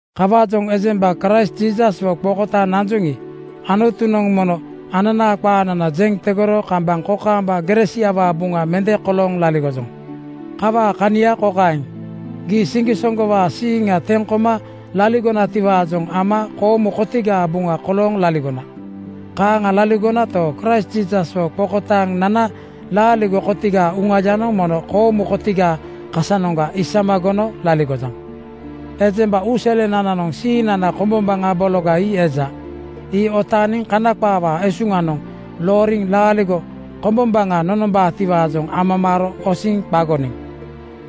Kawaajoŋ ejemba Kraist Jiisaswo qokotaaŋ nanjoŋi, Anutunoŋ mono ananaa qaanana jeŋ tegoro kambaŋ kokaamba gere siawaa buŋa mende kolooŋ laligojoŋ. Kawaa kania kokaeŋ: Gii siŋgisoŋgowaa siiŋa teŋ koma laligonatiwaajoŋ ama koomu kotigaa buŋa kolooŋ laligona. Kaaŋa laligonato, Kraist Jiisaswo qokotaaŋ nana laaligo kotigaa Uŋayanoŋ mono koomu kotigaa kasanoŋga isama gono laligojaŋ. Ejemba uuselenananoŋ siiŋnana kombombaŋa bologa ii eja. Ii otaaniŋ Kana qaawaa esuŋanoŋ looriŋ laaligo kombombaŋa nonombaatiwaajoŋ amamaaro osiŋ qagoniŋ.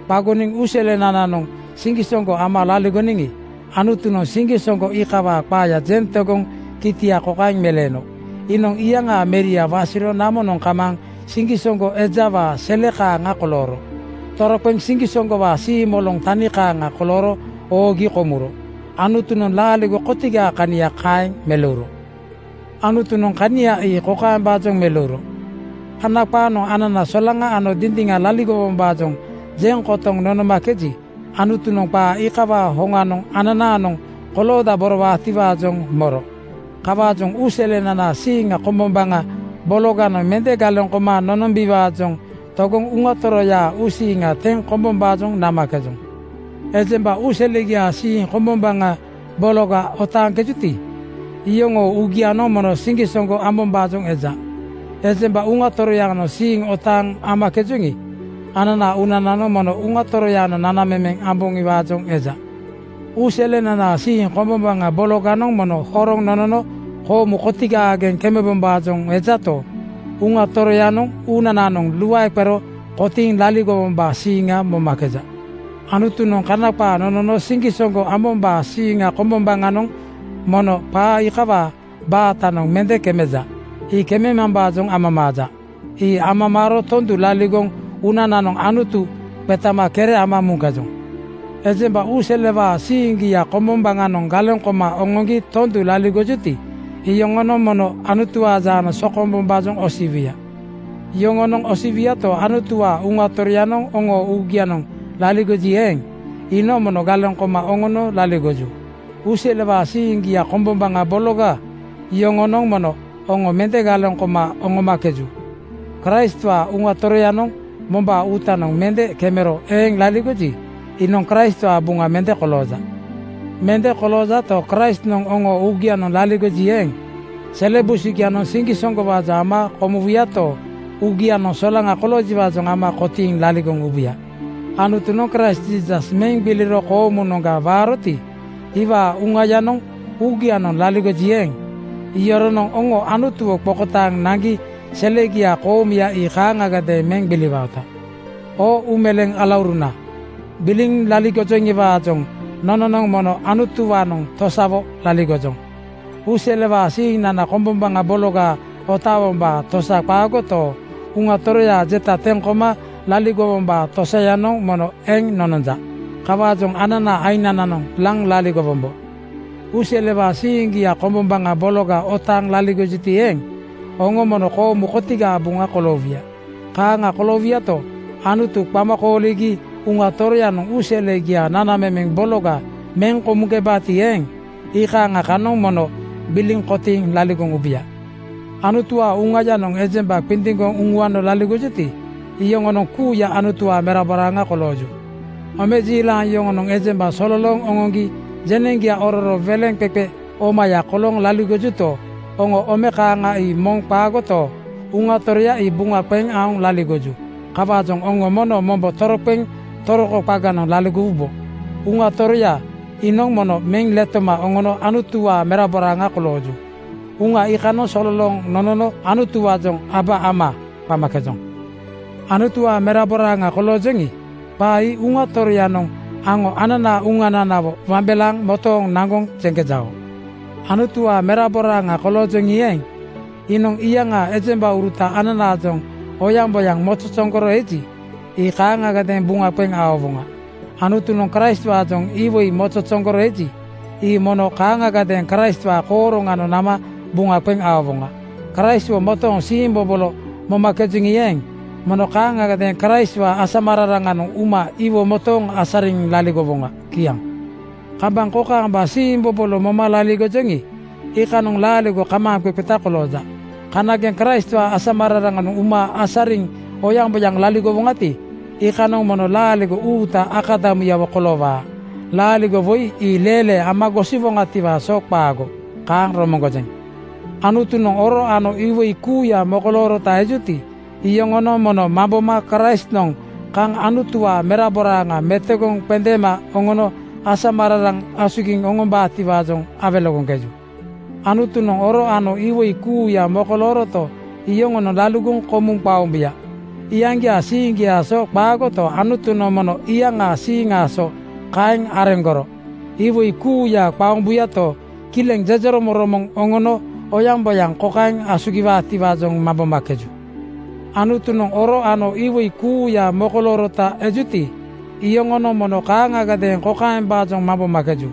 Qagoniŋ uuselenananoŋ siŋgisoŋgo ama laligoniŋi, Anutunoŋ siŋgisoŋgo iikawaa qaaya jeŋ tegoŋ kitia kokaeŋ meleeno: Iinoŋ iyaŋaa Meria wasiro namonoŋ kamaaŋ siŋgisoŋgo ejawaa sele kaaŋa kolooro. Toroqeŋ siŋgisoŋgowaa siimoloŋ tani kaaŋa kolooro oogi komuro. Anutunoŋ laaligo kotigaa kania kaeŋ meleuro. Anutunoŋ kania ii kokaembaajoŋ meleuro: Kana qaanoŋ anana solaŋa ano dindiŋa laligowombaajoŋ jeŋ kotoŋ nonomakeji, Anutunoŋ qaa iikawaa hoŋanoŋ ananaanoŋ koloodaborowaatiwaajoŋ moro. Kawaajoŋ uuselenanaa siiŋa kombombaŋa bologanoŋ mende galeŋ koma nonombiwaajoŋ togoŋ Uŋa Toroyaa uusiiŋa teŋ kombombaajoŋ namakejoŋ. Ejemba uuselegiaa siiŋ kombombaŋa bologa otaaŋkejuti, iyoŋoo uugianoŋ mono siŋgisoŋgo ambombaajoŋ eja. Ejemba Uŋa Toroyaanoŋ siiŋ otaaŋ amakejoŋi, ananaa uunananoŋ mono Uŋa Toroyaanoŋ nanamemeŋ amboŋiwaajoŋ eja. Uuselenanaa siiŋ kombombaŋa bologanoŋ mono horoŋ nonono koomu kotigaageŋ kembombaajoŋ ejato, Uŋa Toroyanoŋ uunananoŋ luae qero kotiiŋ laligowombaa siiŋa momakeja. Anutunoŋ Kana qaa nonono siŋgisoŋgo ambombaa siiŋ kombombaŋanoŋ mono qaa iikawaa baatanoŋ mende kemakeja. Ii kemambaajoŋ amamaaja. Ii amamaaro tondu laligoŋ uunananoŋ Anutu qetama kere ama muŋkejoŋ. Ejemba uuselewaa siiŋgia kombombaŋanoŋ galeŋ koma oŋoŋgi tondu laligojuti, iyoŋonoŋ mono Anutuwaa jaanoŋ sokombombaajoŋ osiwuya. Yoŋonoŋ osiwuyato, Anutuwaa Uŋa Toroyanoŋ oŋoo uugianoŋ laligoji eeŋ, iinoŋ mono galeŋ koma oŋono laligoju. Uuselewaa siiŋgia kombombaŋa bologa yoŋonoŋ mono oŋo mende galeŋ koma oŋomakeju. Kraistwaa Uŋa Toroyanoŋ mombaa uutanoŋ mende kemero eeŋ laligoji, iinoŋ Kraistwaa buŋa mende kolooja. Mende koloojato, Kraistnoŋ oŋoo uugianoŋ laligoji eeŋ, sele busugianoŋ siŋgisoŋgowaajoŋ ama komuwuyato, uŋagianoŋ solaŋa koloojutiwaajoŋ ama kotiiŋ laligoŋ ubuya. Anutunoŋ Kraist Jiisas meŋ gbiliro koomunoŋga waaroti, iwaa Uŋayanoŋ uugianoŋ laligoji eeŋ, iyoronoŋ oŋo Anutuwo qokotaaŋ naŋgi selegia koomuya ii kaaŋagadeeŋ meŋ gbiliwaota. Oo uumeleeŋ alauruna, gbiliŋ laligojoŋiwaajoŋ nononoŋ mono Anutuwaanoŋ tosawo laligojoŋ. Uuselewaa siiŋnana kombombaŋa bologa otaawombaa tosaga qaagoto, Uŋa Toroyaa jeta teŋ koma laligowombaa tosayanoŋ mono eŋ nononja. Kawaajoŋ ananaa aiŋnananoŋ laŋ laligowombo. Uuselewaa siiŋgia kombombaŋa bologa otaaŋ laligojuti eeŋ, oŋo mono koomu kotigaa buŋa koloowuya. Kaaŋa koloowuyato, Anutu qama kooligi Uŋa Toroyanoŋ uuselegiaa nanamemeŋ bologa meŋ komuŋkebaati eeŋ, iikaaŋa kanoŋ mono gbiliŋ kotiiŋ laligoŋ ubuya. Anutuwaa Uŋayanoŋ ejemba qindiŋgoŋ uŋuano laligojuti, iyoŋonoŋ kuuya Anutuwaa meraboraaŋa kolooju. Omejiilaŋ yoŋonoŋ ejemba sololooŋ oŋoŋgi jeneŋgia ororo weleŋqeqe omaya kolooŋ laligojuto, oŋo ome kaaŋa ii moŋ qaagoto, Uŋa Toroya ii buŋa qeŋ aoŋ laligoju. Kawaajoŋ oŋo mono mombo toroqeŋ toroko qaganoŋ laligowubo. Uŋa Toroya iinoŋ mono meŋ letoma oŋono Anutuwaa meraboraaŋa kolooju. Uŋa iikanoŋ sololooŋ nonono Anutuwaajoŋ “Aba Ama!” qamakejoŋ. Anutuwaa meraboraaŋa koloojoŋi, qaa ii Uŋa Toroyanoŋ aŋo ananaa uŋananawo wambelaaŋ motooŋ naŋgoŋ jeŋkejao. Anutuwaa meraboraaŋa koloojoŋi eeŋ, iinoŋ iyaŋaa ejembauruta ananaajoŋ oyaŋboyaŋ mozozoŋgoro eji, ii kaaŋagadeeŋ buŋa qeŋ aowoŋa. Anutunoŋ Kraistwaajoŋ iwoi mozozoŋgoro eji, ii mono kaaŋagadeeŋ Kraistwaa kooroŋanoŋ nama buŋa qeŋ aowoŋa. Kraistwo motooŋ siimbobolo momakejoŋi eeŋ, mono kaaŋagadeeŋ Kraistwaa asamararaŋanoŋ uma iwo motooŋ asariŋ laligowoŋa. Kiaŋ. Kambaŋ kokaamba siimbobolo moma laligojoŋi, iikanoŋ laaligo kamaaŋqeqeta kolooja. Kanageŋ Kraistwaa asamararaŋanoŋ uma asariŋ oyaŋboyaŋ laligowoŋati, iikanoŋ mono laaligo uuta akadamuyawo koloowaa. Laaligo woi ii leelee ama gosiwoŋatiwaa so qaago. Kaaŋ romoŋgojeŋ. Anutunoŋ oro ano iwoi kuuya mokoloorota ejuti, iyoŋonoŋ mono mamboma Kraistnoŋ kaŋ Anutuwaa meraboraaŋa metogoŋ qendeema oŋono asamararaŋ asugiŋ oŋombaatiwaajoŋ awelegoŋkeju. Anutunoŋ oro ano iwoi kuuya mokolooroto, yoŋonoŋ laligoŋ komuŋ qaombuya. Iyaŋgiaa siiŋgiaa so qaagoto, Anutunoŋ mono iyaŋaa siiŋaa so kaeŋ areŋgoro. Iwoi kuuya qaombuyato, kileŋ jejeromoŋromoŋ oŋono oyaŋboyaŋ kokaeŋ asugiwaatiwaajoŋ mambomakeju: Anutunoŋ oro ano iwoi kuuya mokoloorota ejuti, iyoŋonoŋ mono kaaŋagadeeŋ kokaembaajoŋ mambomakeju: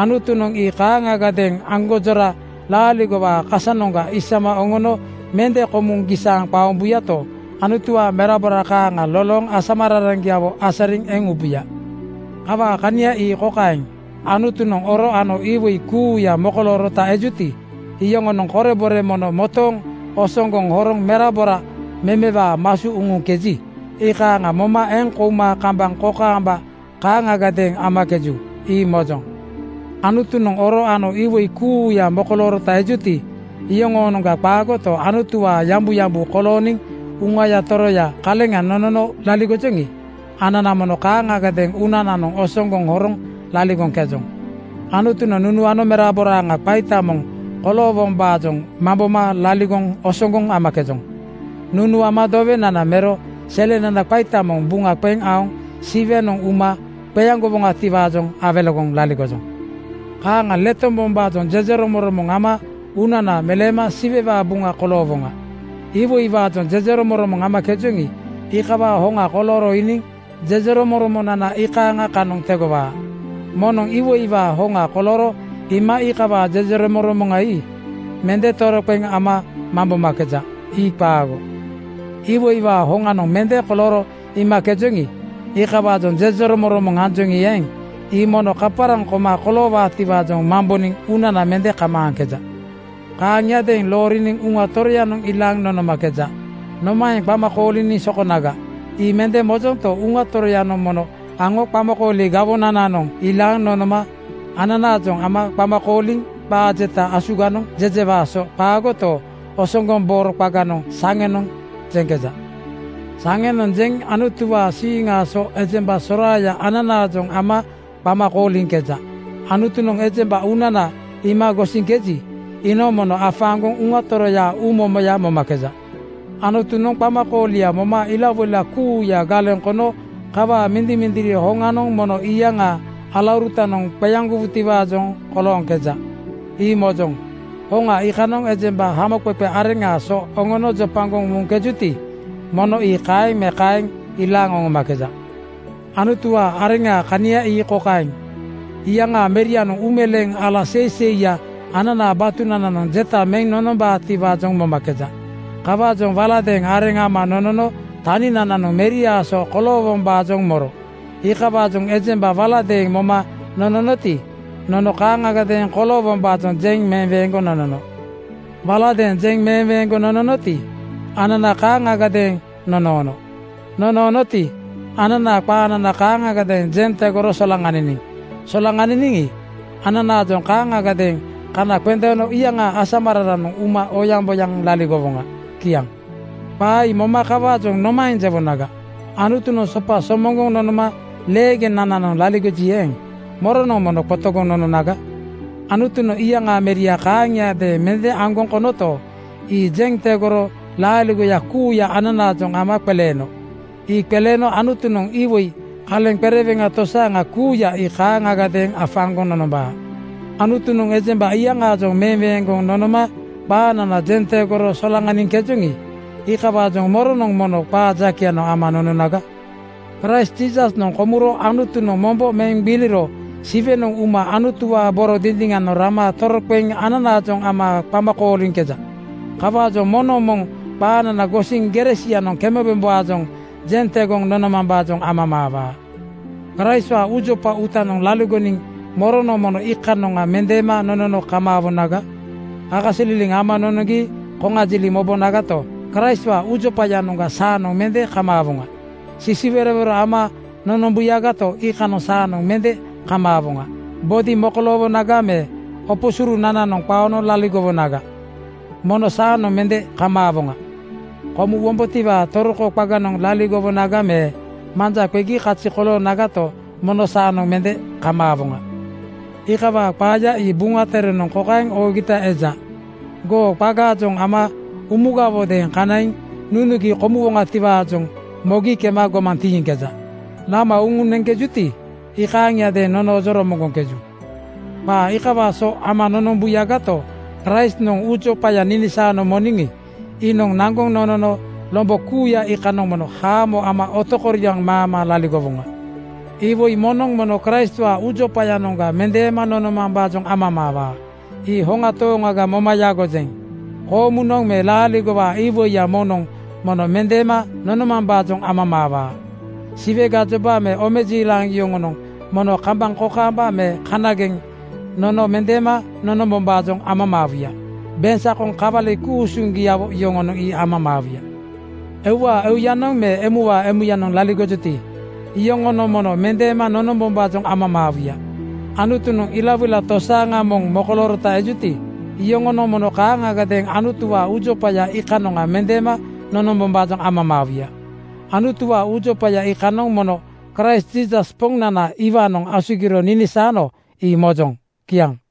Anutunoŋ ii kaaŋagadeeŋ aŋgonjora laaligowaa kasayanoŋga isama oŋono mende komuŋ gisaaŋ qaombuyato, Anutuwaa merabora kaaŋa lolooŋ asamararaŋgiawo asariŋ eŋ ubuya. Kawaa kania ii kokaeŋ: Anutunoŋ oro ano iwoi kuuya mokoloorota ejuti, iyoŋonoŋ korebore mono motooŋ osoŋgoŋ horoŋ merabora memewaa masu uŋuŋkeji, iikaaŋa moma eŋ kouma kambaŋ kokaamba kaaŋagadeeŋ amakeju, ii mojoŋ. Anutunoŋ oro ano iwoi kuuya mokoloorota ejuti, iyoŋoonoŋga qaagoto, Anutuwaa yambuyambu kolooniŋ Uŋaya Toroya kaleŋa nonono laligojoŋi, anana mono kaaŋagadeeŋ uunananoŋ osoŋgoŋ horoŋ laligoŋkejoŋ. Anutunoŋ nunuano meraboraaŋa qaita moŋ koloowombaajoŋ mamboma laligoŋ osoŋgoŋ amakejoŋ. Nunuama dowenana mero selenana qaita moŋ buŋa qeŋ aoŋ Siwenoŋ uma qeaŋgowaatiwaajoŋ awelegoŋ laligojoŋ. Kaaŋa letombombaajoŋ jejeromoŋromoŋ ama uunana meleema Siwewaa buŋa koloowoŋa. Iwoiwaajoŋ jejeromoŋromoŋ amakejoŋi, iikawaa hoŋa kolooro iiniŋ jejeromoŋromonana iikaaŋa kanoŋ tegowaa. Moŋnoŋ iwoiwaa hoŋa kolooro iima iikawaa jejeromoŋromoŋa ii mende toroqeŋ ama mambomakeja. Ii qaago. Iwoiwaa hoŋanoŋ mende kolooro iimakejoŋi, iikawaajoŋ jejeromoŋromoŋ anjoŋi eeŋ, ii mono kaparaŋ koma koloowaatiwaajoŋ mamboniŋ uunana mende kamaaŋkeja. Kaaŋiadeeŋ looriniŋ Uŋa Toroyanoŋ ilaaŋ nonomakeja. Nomaeŋ qama kooliniŋ sokonaga, ii mende mojonto, Uŋa Toroyanoŋ mono aŋo qamakooli gawonananoŋ ilaaŋ nonoma ananaajoŋ ama qama kooliŋ qaa jeta asuganoŋ jejewaa so qaagoto, osoŋgoŋbooro qaganoŋ saŋenoŋ jeŋkeja. Saŋenoŋ jeŋ Anutuwaa siiŋaa so ejemba soraaya ananaajoŋ ama qama kooliŋkeja. Anutunoŋ ejemba uunana iima gosiŋkeji, iinoŋ mono afaaŋgoŋ Uŋa Toroyaa uumomoya momakeja. Anutunoŋ qamakoolia moma ilawoila kuuya galeŋ kono kawaa mindimindiri hoŋanoŋ mono iyaŋaa alaurutanoŋ qeaŋgowutiwaajoŋ kolooŋkeja. Ii mojoŋ. Hoŋa iikanoŋ ejemba hamoqeqe areŋaa so oŋoono jopagoŋ muŋkejuti, mono ii kaeŋ me kaeŋ ilaaŋ oŋomakeja. Anutuwaa areŋaa kania ii kokaeŋ: Iyaŋaa Merianoŋ uumeleeŋ ala seiseiya ananaa batunananoŋ jeta meŋ nonombaatiwaajoŋ momakeja. Kawaajoŋ waladeeŋ areŋ ama nonono taninananoŋ Meriaa so koloowombaajoŋ moro. Iikawaajoŋ ejemba waladeeŋ moma nononoti, nono kaaŋagadeeŋ koloowombaajoŋ jeŋ meweeŋgoŋ nonono. Waladeeŋ jeŋ meweeŋgoŋ nononoti, anana kaaŋagadeeŋ nonoono. Nonoonoti, ananaa qaanana kaaŋagadeeŋ jeŋ tegoro solaŋaniniŋ. Solaŋaniniŋi, ananaajoŋ kaaŋagadeeŋ kana qendeeno iyaŋaa asamararaŋanoŋ uma oyaŋboyaŋ laligowoŋa. Kiaŋ. Qaa ii moma kawaajoŋ nomaeŋ jewonaga? Anutunoŋ sopa somoŋgoŋ nonoma leegenananoŋ laligoji eeŋ, moronoŋ mono qotogoŋ nononaga? Anutunoŋ iyaŋaa Meria kaaŋiadeeŋ mende aŋgoŋ konoto, ii jeŋ tegoro laaligoya kuuya ananaajoŋ ama qeleeno. Ii qeleeno Anutunoŋ iwo kaleŋ qereweŋa tosaaŋa kuuya ii kaaŋagadeeŋ afaaŋgoŋ nonombaa. Anutunoŋ ejemba iyaŋaajoŋ meweeŋgoŋ nonoma qaanana jeŋ tegoro solaŋaniŋkejoŋi, iikawaajoŋ moronoŋ mono qaa jakeyanoŋ ama nononaga? Kraist Jiisasnoŋ komuro Anutunoŋ mombo meŋ gbiliro Siwenoŋ uma Anutuwaa boro dindiŋanoŋ rama toroqeŋ ananaajoŋ ama qama kooliŋkeja. Kawaajoŋ moŋnoŋ moŋ qaanana gosiŋ gere sianoŋ kemebombaajoŋ jeŋ tegoŋ nonomambaajoŋ amamaawaa. Kraistwaa uujopa uutanoŋ laligoniŋ moronoŋ mono iikanoŋa mendeema nonono kamaawonaga? Kakasililiŋ ama nonoŋgi koŋajiliŋ mobonagato, Kraistwaa uujopayanoŋga saanoŋ mende kamaawoŋa. Sisiwerowero ama nonombuyagato, iikanoŋa saanoŋ mende kamaawoŋa. Bodi mokoloowonaga me opo surunananoŋ qaono laligowonaga, mono saanoŋ mende kamaawoŋa. Komuwombotiwaa toroko qaganoŋ laligowonaga me manja qegi kazi koloonagato, mono saanoŋ mende kamaawoŋa. Iikawaa qaaya ii Buŋa Terenoŋ kokaeŋ oogita eja, “Goo qagaajoŋ ama umugawodeeŋ kanaiŋ nunugi komuwoŋatiwaajoŋ mogi kema gomaŋ tiiŋkeja. Lama uŋuŋ neŋkejuti, iikaaŋiadeeŋ nonoojoŋ romoŋgoŋkeju.” Qaa iikawaa so ama nonombuyagato, Kraistnoŋ uujopaya ninisaano moniŋi, iinoŋ naŋgoŋ nonono lombo kuuya iikanoŋ mono haamo ama otokoriaŋ maama laligowoŋa. Iwoi moŋnoŋ mono Kraistwaa uujopayanoŋga mendeema nonomambaajoŋ amamaawaa. Ii hoŋa tooŋaga moma yagojeŋ. Koomunoŋ me laaligowaa iwoiya moŋnoŋ mono mendeema nonomambaajoŋ amamaawaa. Siwe gajoba me omejiilaŋ yoŋonoŋ mono kambaŋ kokaamba me kanageŋ nono mendeema nonombombaajoŋ amamaawuya. Beŋsakoŋ kawali ku-usuŋgiawo yoŋonoŋ ii amamaawuya. Euwaa euyanoŋ me emuwaa emuyanoŋ laligojuti, iyoŋonoŋ mono mendeema nonombombaajoŋ amamaawuya. Anutunoŋ ilawoila tosaaŋa moŋ mokoloorota ejuti, iyoŋonoŋ mono kaaŋagadeeŋ Anutuwaa uujopaya iikanoŋa mendeema nonombombaajoŋ amamaawuya. Anutuwaa uujopaya iikanoŋ mono Kraist Jiisas Poŋnana iwaanoŋ asugiro ninisaano ii mojoŋ. Kiaŋ.